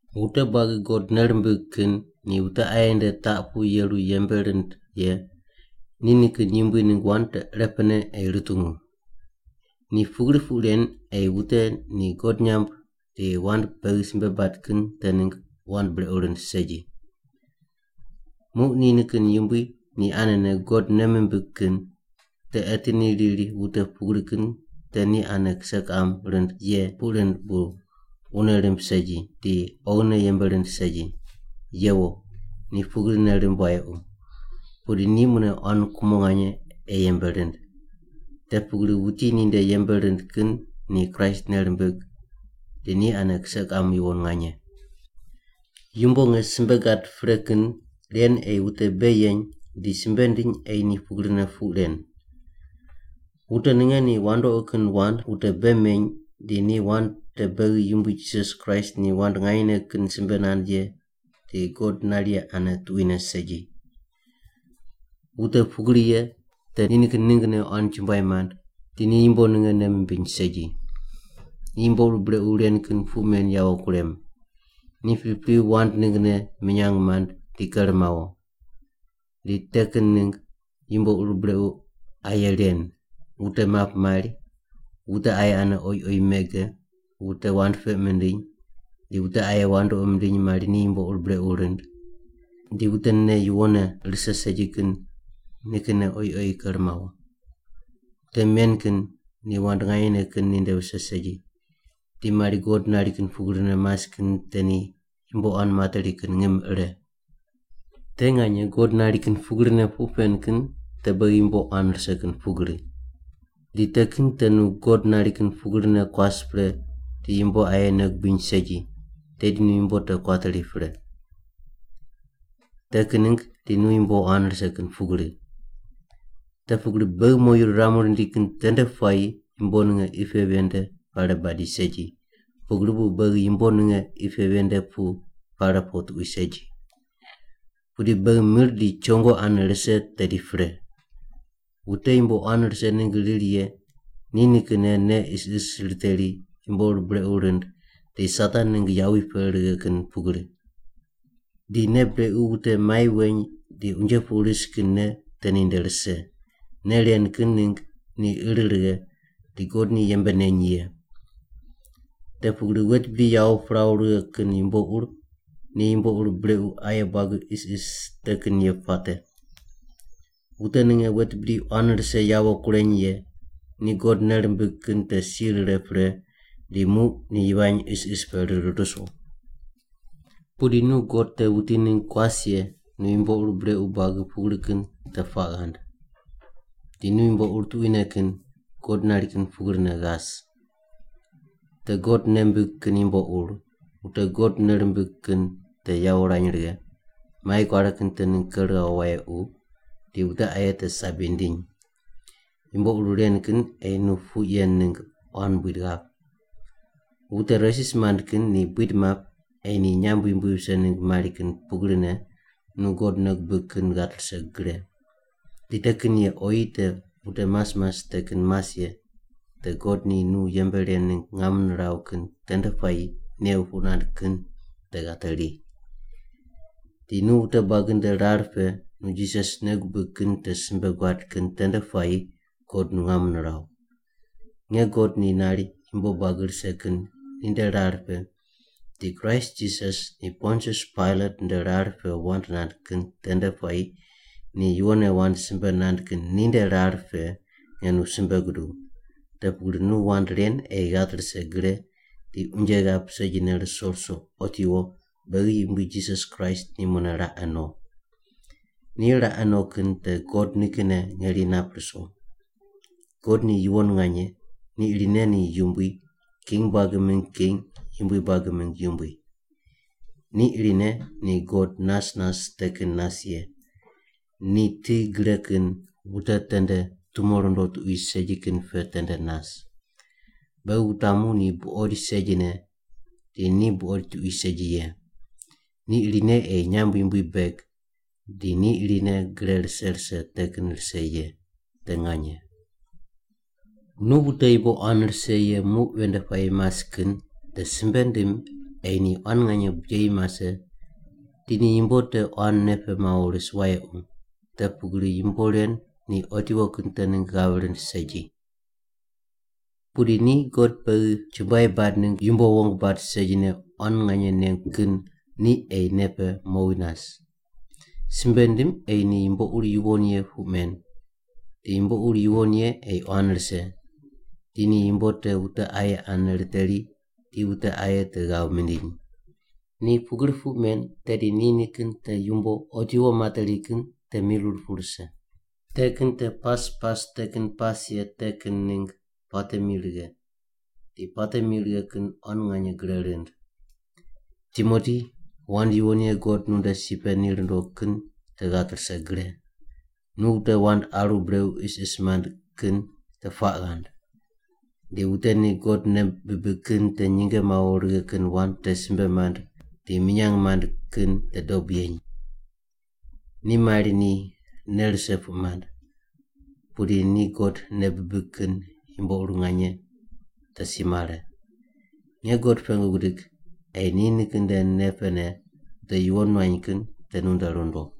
Wute buagi God nei rimbig kin ni wute aye nde taq pu yeru yembe rind ye ni nikin yumbui ningg wand te irepene ei rutungu. Ni pugri puq ren ei wute ni God nyamb di wand beghi simbe bad kin te ningg wand brequ rind segi. Muq ni nikin yumbui ni anene God nei mimbig kin te eti ni riri wute pugri kin te ni ane kise kiqam rind ye puq rind bu wune rimb segi di oghine yembe rind segi. Yewo, ni pugri nei rimb wayequ, pudi ni mune quan kumo nganye ei yembe rind. Te pugri wuti ninde yembe rind kin ni Kraist nei rimbig di ni ane kise kiqam yuwon nganye. Yumbo nge simbe gad pre kin ren ei wute bei yeny di simbe ndiny ei ni pugrine puq ren. Wute ninge ni wandoqi kin wand wute bei meny di ni wand te beghi Yumbui Jisas Kraist ni wand nganyene kin simbe nand ye di God nari ye ane tuquine segi. Wute pugri ye te ni nikin ninggne quan chumbuai mand di ni yumbo ninge nei mimbiny segi. Ni yumbo ur brequ ren kin puq men yawo kurem. Ni pripri wand ninggne minyang mand di ker mawo. Di te kin ningg yumbo ur brequ aye ren: Wute map mari, wute aye ane oyi oyi mege, wute wand peq mindiny, di wute aye wandoqi mindiny mari ni yumbo ur brequ rind. Di wute nei yuwonne rise segi kin nikinne oyi oyi ker mawo. Wute men kin ni wand nganyene kin ninde vise segi, di mari God nari kin pugrine mas kin te ni yumbo quan materi kin ngim ire. Te nganye God nari kin pugrine puq pen kin te beghi yumbo quan rise kin pugri. Di te kin te nu God nari kin pugrine kuas pre di yumbo aye nei gubiny segi, tedi nu yumbo te kuateri pre. Te kin ningg di nu yumbo quan rise kin pugri. Te pugri beghi moyu riramu rindi kin tende puayi yumbo ninge qi pe ven nde pare badi segi, pugri bu beghi yumbo ninge qi pe ven nde pu pare po tuqui segi. Pudi beghi mir di chongo ane rise tedi pre. Wute yumbo quan rise ningg riri ye ni nikinne nei isis riteri yumbo ur brequ rind di Satan ningg yawi pe righe kin pugri. Di nei brequ wute mai weny di unje pu ris kin nei te ninde rise. Nei ren kin ningg ni ir righe di God ni yembe neny ye. Te pugri wet bidi yawo piraw righe kin yumbo ur ni yumbo ur brequ aye buagi isis te kin ye puate. Wute ninge wet bidi quan rise yawo kureny ye ni God nei rimbig kin te si rire pre di muq ni yivany isis pe rir ruso. Pudi nu God te wuti ningg kuas ye nu yumbo ur brequ buagi pugri kin te puaq ghand. Di nu yumbo ur tuquine kin, God nari kin pugrine ghas. Te God nei mbig kin yumbo ur, wute God nei rimbig kin te yawo rany righe, mai kuare kin te ningg ker ghawo wayequ, di wute aye te sabi ndiny. Yumbo ur ren kin ei nu puq yen ningg quan buid ghap. Wute resis mand kin ni buid map ei ni nyamb yumbui vise ningg mari kin pugrine nu God nei gubig kin ghat rise gre. Di te kin ye oyi te wute mas mas te kin mas ye te God ni nu yembe ren ningg ngam niraw kin tende puayi new puq nand kin te ghateri. Di nu wute buagi nde rar pe nu Jisas nei gubig kin te simbe guad kin tende puayi God nu ngam niraw. Nge God ni nari yumbo buagi rise kin ninde rar pe di Kraist Jisas ni Pontius Pailat nde rar pe wand nand kin tende puayi ni yuwonne wand simbe nand kin ninde rar pe nge nu simbe guduw, te pugri nu wand ren ei ghat rise gre di unje ghap segine ruso ruso otiwo beghi Yumbui Jisas Kraist ni mune raqe no. Ni raqe no kin te God nikinne ngeri nap ruso. God ni yuwon nganye, ni irine ni Yumbui, king buagi mingg King, yumbui buagi mingg Yumbui. Ni irine ni God nas nas te kin nas ye, ni ti gre kin wute tende tumo rundo tuqui segi kin pe tende nas. Beghi wutamu ni buqoid segine di ni buqoid tuqui segi ye. Ni irine ei nyamb yumbui beg di ni irine gre rise rise te kin rise ye. Te nganye. Nu wute yumbo quan rise ye muq ven nde puayi mas kin te simbe ndim ei ni quan nganye bijeyi mase di ni yumbo te quan nei pe mawo ris wayequ, te pugri yumbo ren ni otiwo kin te ningg ghav rind segi. Pudi ni God beghi chumbuai bad ningg yumbo wong bad segine quan nganye nengu kin ni ei nei pe mowi nas. Simbe ndim ei ni yumbo ur yuwon ye puq men, di yumbo ur yuwon ye ei quan rise, di ni yumbo te wute aye ane riteri di wute aye te ghav mindiny. Ni pugri puq men tedi ni nikin te yumbo otiwo materi kin te mirir pu rise. Te kin te pas pas te kin pas ye te kin ningg puate mi righe, di puate mi righe kin quan nganye gre rind. Timoti, wand yuwon ye God nunde si pe ni rundo kin te ghat rise gre. Nu wute wand aru brequ isis mand kin te puaq ghand. Di wute ni God nei bibig kin te nyinge mawo righe kin wand te simbe mand di minyang mand kin te dob yeny. Ni mari ni nei rise puq mand, pudi ni God nei bibig kin yumbo ur nganye te si mare. Nge God pengu gidig ei ni nikin nde nei pene wute yuwon nuany kin te nunde rundo.